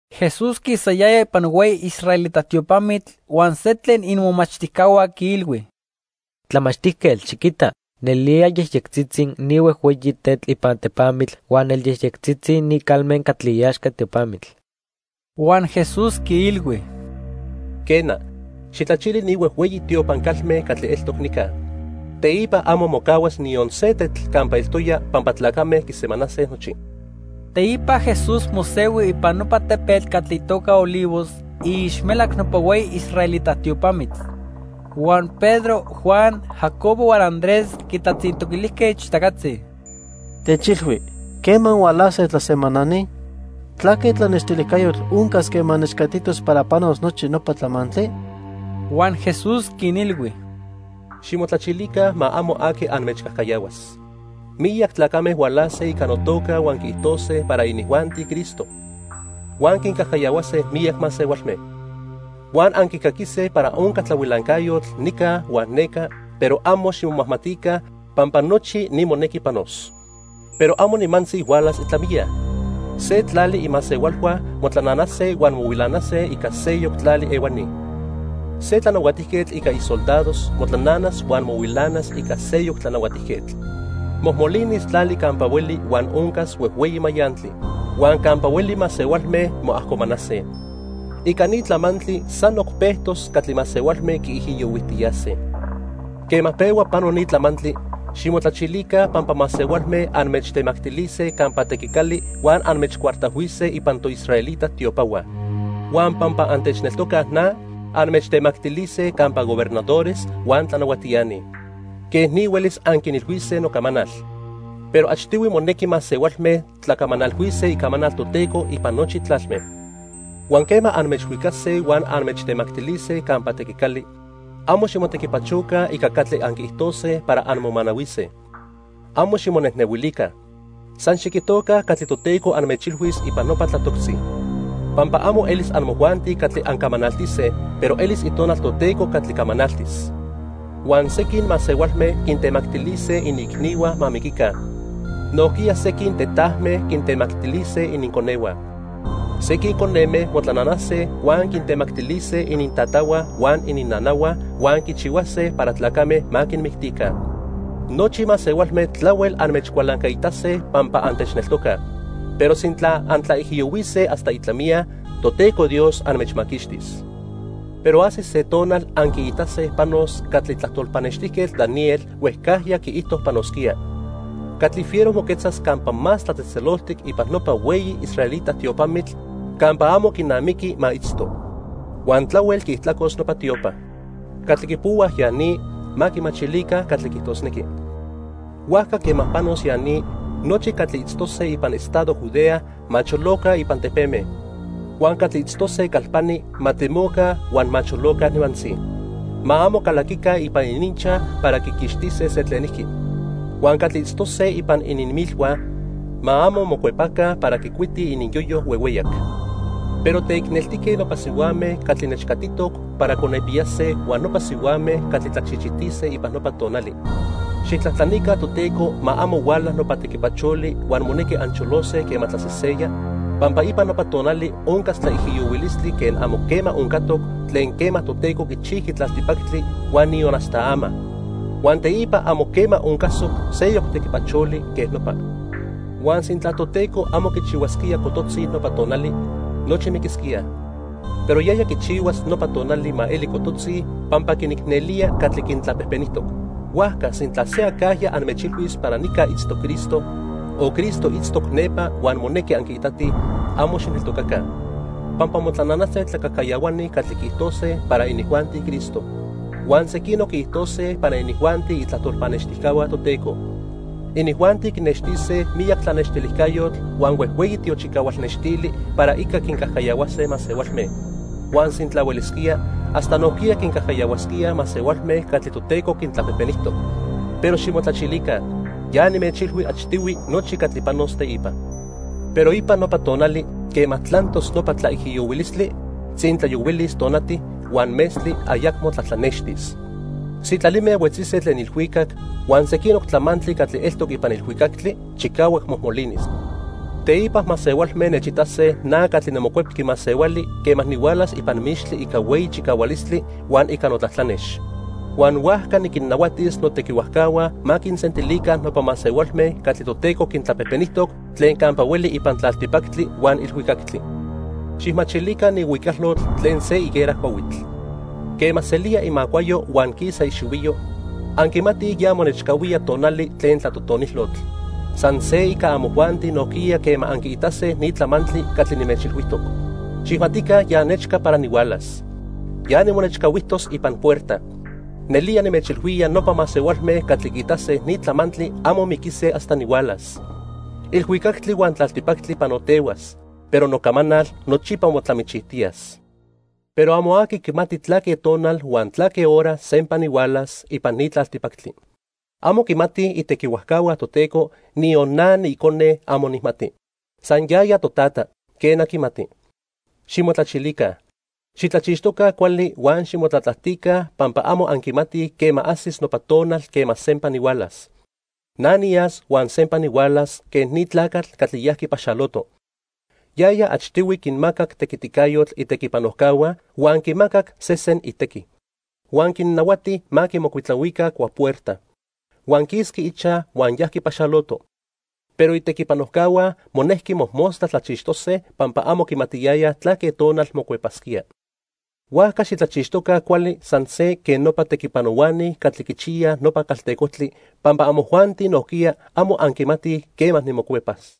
Jesús quisayaya ipan hueyi israelita tiopamitl huan se tlen imomachtijcahua quiilhui: —¡Tlamachtijquetl, xiquita! Nelía yejyectzitzi ni huejhueyi tetl ipan tepamitl huan nelyejyectzitzi ni calme catli iaxca tiopamitl. Huan Jesús quiilhui: —Quena, xijtlachili ni huejhueyi tiopan calme catli eltoc nica. Teipa amo mocahuas niyon se tetl campa eltoya pampa tlacame quisemanase nochi. Teipa Jesús mosehui ipan nopa tepetl catli itoca Olivos iixmelac nopa hueyi israelita tiopamitl. Huan Pedro, Juan, Jacobo huan Andrés quitlatzintoquilijque ichtacatzi: —Techilhui, ¿quema hualase tlasemanani? ¿Tlaque tlanextilijcayotl oncas quema nechcatitos para panos nochi nopa tlamantli? Huan Jesús quinilhui: "Ximotlachilica ma amo aqui anmechcajcayahuas. Miyac tlacame hualase ica notoca huan quiijtose para inijuanti Cristo: huan quincajcayahuase miyac masehualme. "Huan anquicaquise para onca tlahuilancayotl nica huan neca, pero amo ximomajmatica, pampa nochi ni monequi panos. Pero amo nimantzi hualas itlamiya. Se tlali imasehualhua motlananase huan mohuilanase ica seyoc tlali ehuani. Se tlanahuatijquetl ica isoldados motlananas huan mohuilanas ica seyoc tlanahuatijquetl. Mojmolinis tlali campa hueli huan oncas huejhueyi mayantli. Huan campa hueli masehualme moajcomanase. Ica ni tlamantli sanoc pejtos catli masehualme quiijiyohuijtiyase. "Quema pehua pano ni tlamantli, ximotlachilica pampa masehualme anmechtemactilise campa tequicali huan anmechcuartajhuise ipan toisraelita tiopahua. Huan pampa antechneltocaj na, anmechtemactilise campa gobernadores huan tlanahuatiani. Quej ni huelis anquinilhuise nocamanal. Pero achtihui monequi masehualme tlacamanalhuise icamanal Toteco ipan nochi tlalme. Huan quema anmechhuicase huan anmechtemactilise campa tequicali, amo ximotequipachoca ica catli anquiijtose para anmomanahuise. Amo ximonejnehuilica. San xiquijtoca catli Toteco anmechilhuis ipan nopa tlatoctzi, pampa amo elis amojuanti catli ancamanaltise, pero elis Itonal Toteco catli camanaltis. "Huan sequin masehualme quintemactilise iniicnihua ma miquica. Nojquiya sequin tetajme quintemactilise ininconehua. Sequin coneme motlananase huan quintemactilise inintatahua huan ininnanahua huan quichihuase para tlacame ma quinmictica. Nochi masehualme tlahuel anmechcualancaitase pampa antechneltocaj, pero sintla antlaijiyohuise hasta itlamiya, Toteco Dios anmechmaquixtis. "Pero ajsis se tonal anquiitase panos catli tlajtol pannextijquetl Daniel huejcajya quiijto panosquía. Catli fiero moquetzas Campa Más Tlatzejtzeloltic ipan nopa hueyi israelita tiopamitl campa amo quinamiqui ma itzto. Huan tlahuel quiijtlacos nopa tiopa. (Catli quipohuaj ya ni, ma quimachilica catli quiijtosnequi.) Huajca quema panos ya ni, nochi catli itztose ipan estado Judea ma choloca ipan tepeme. Huan catli itztose calpani ma temoca huan ma choloca nimantzi; ma amo calaquica ipan ininchaj para quiquixtise se tlenijqui. Huan catli itztose ipan ininmilhua ma amo mocuepaca para quicuitij ininyoyo huehueyac. ¡Pero teicneltique nopa sihuame catli nechcatitoc para conepiyase huan nopa sihuame catli tlachichitise ipan nopa tonali! Xijtlajtlanica Toteco ma amo huala nopa tequipacholi huan monequi ancholose quema tlaseseya, pampa ipan nopa tonali oncas tlaijiyohuilistli quen amo quema oncatoc tlen quema Toteco quichijqui tlaltipactli huan niyon hasta ama. Huan teipa amo quema oncasoc seyoc tequipacholi quej nopa. Huan sintla Toteco amo quichihuasquía cototzi nopa tonali, nochi miquisquíaj. Pero yaya quichihuas nopa tonali ma eli cototzi pampa quinicnelía catli quintlapejpenijtoc. "Huajca sintla se acajya anmechilhuis para nica itztoc Cristo, o Cristo itztoc nepa huan monequi anquiitatij, amo xijneltocaca. Pampa motlananase tlacajcayahuani catli quiijtose para inijuanti Cristo, huan sequinoc quiijtose para inijuanti itlajtol pannextijcahua Toteco. Inijuanti quinextise miyac tlanextilijcayotl huan huejhueyi tiochicahual nextili para ica quincajcayahuase masehualme. Huan sintla huelisquía, hasta nojquiya quincajcayahuasquíaj masehualme catli Toteco quintlapejpenijtoc. Pero ximotlachilica, ya nimechilhui achtihui nochi catli panos teipa. "Pero ipan nopa tonali, quema tlantos nopa tlaijiyohuilistli, tzintlayohuilis tonati, huan metztli ayacmo tlatlanextis. Sitlalime huetzise tlen ilhuicac, huan sequinoc tlamantli catli eltoc ipan ilhuicactli chicahuac mojmolinis. Teipa masehualme nechitase na catli niMocuepqui Masehuali quema nihualas ipan mixtli ica hueyi chicahualistli huan ica notlatlanex. Huan huajca niquinnahuatis notequihuajcahua ma quinsentilica nopa masehualme catli Toteco quintlapejpenijtoc tlen campa hueli ipan tlaltipactli huan ilhuicactli. "Xijmachilica ni huicalotl tlen se higuera cuahuitl. Quema selía imacuayo huan quisa ixihuiyo, anquimatij ya monechcahuía tonali tlen tlatotonilotl. San se ica amojuanti nojquiya quema anquiitase ni tlamantli catli nimechilhuijtoc, xijmatica ya nechca para nihualas. Ya nimonechcahuijtos ipan puerta. Nelía nimechilhuía nopa masehualme catli quiitase ni tlamantli amo miquise hasta nihualas. Ilhuicactli huan tlaltipactli panotehuas, pero nocamanal nochipa motlamichijtiyas. "Pero amo aqui quimati tlaque tonal huan tlaque hora sempa nihualas ipan ni tlaltipactli. Amo quimatij itequihuajcahua Toteco, niyon na niIcone amo nijmati. San yaya Totata, quena quimati. "Ximotlachilica, xitlachixtoca cuali huan ximotlatlajtica pampa amo anquimatij quema ajsis nopa tonal quema sempa nihualas. Na niyas huan sempa nihualas quen ni tlacatl catli yajqui paxaloto. Yaya achtihui quinmacac tequiticayotl itequipanojcahua huan quimacac sesen itequi. Huan quinnahuati ma quimocuitlahuica cuapuerta. Huan quisqui ichaj huan yajqui paxaloto, pero itequipanojcahua monejqui mojmostla tlachixtose pampa amo quimatiyayaj tlaque tonal mocuepasquía. Huajca xitlachixtoca cuali san se quen nopa tequipanohuani catli quichiyaj nopa caltecojtli pampa amojuanti nojquiya, amo anquimatij quema nimocuepas.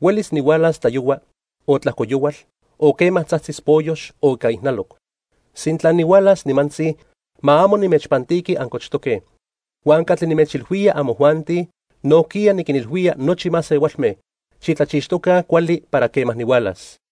Huelis nihualas tlayohua, o tlajco yohual, o quema tzajtzis poyox o ica ijnaloc. Sintla nihualas nimantzi, ma amo nimechpantiqui ancochtoque. Huan catli nimechilhuía amojuanti, nojquiya niquinilhuía nochi masehualme. Xitlachixtoca cuali para quema nihualas."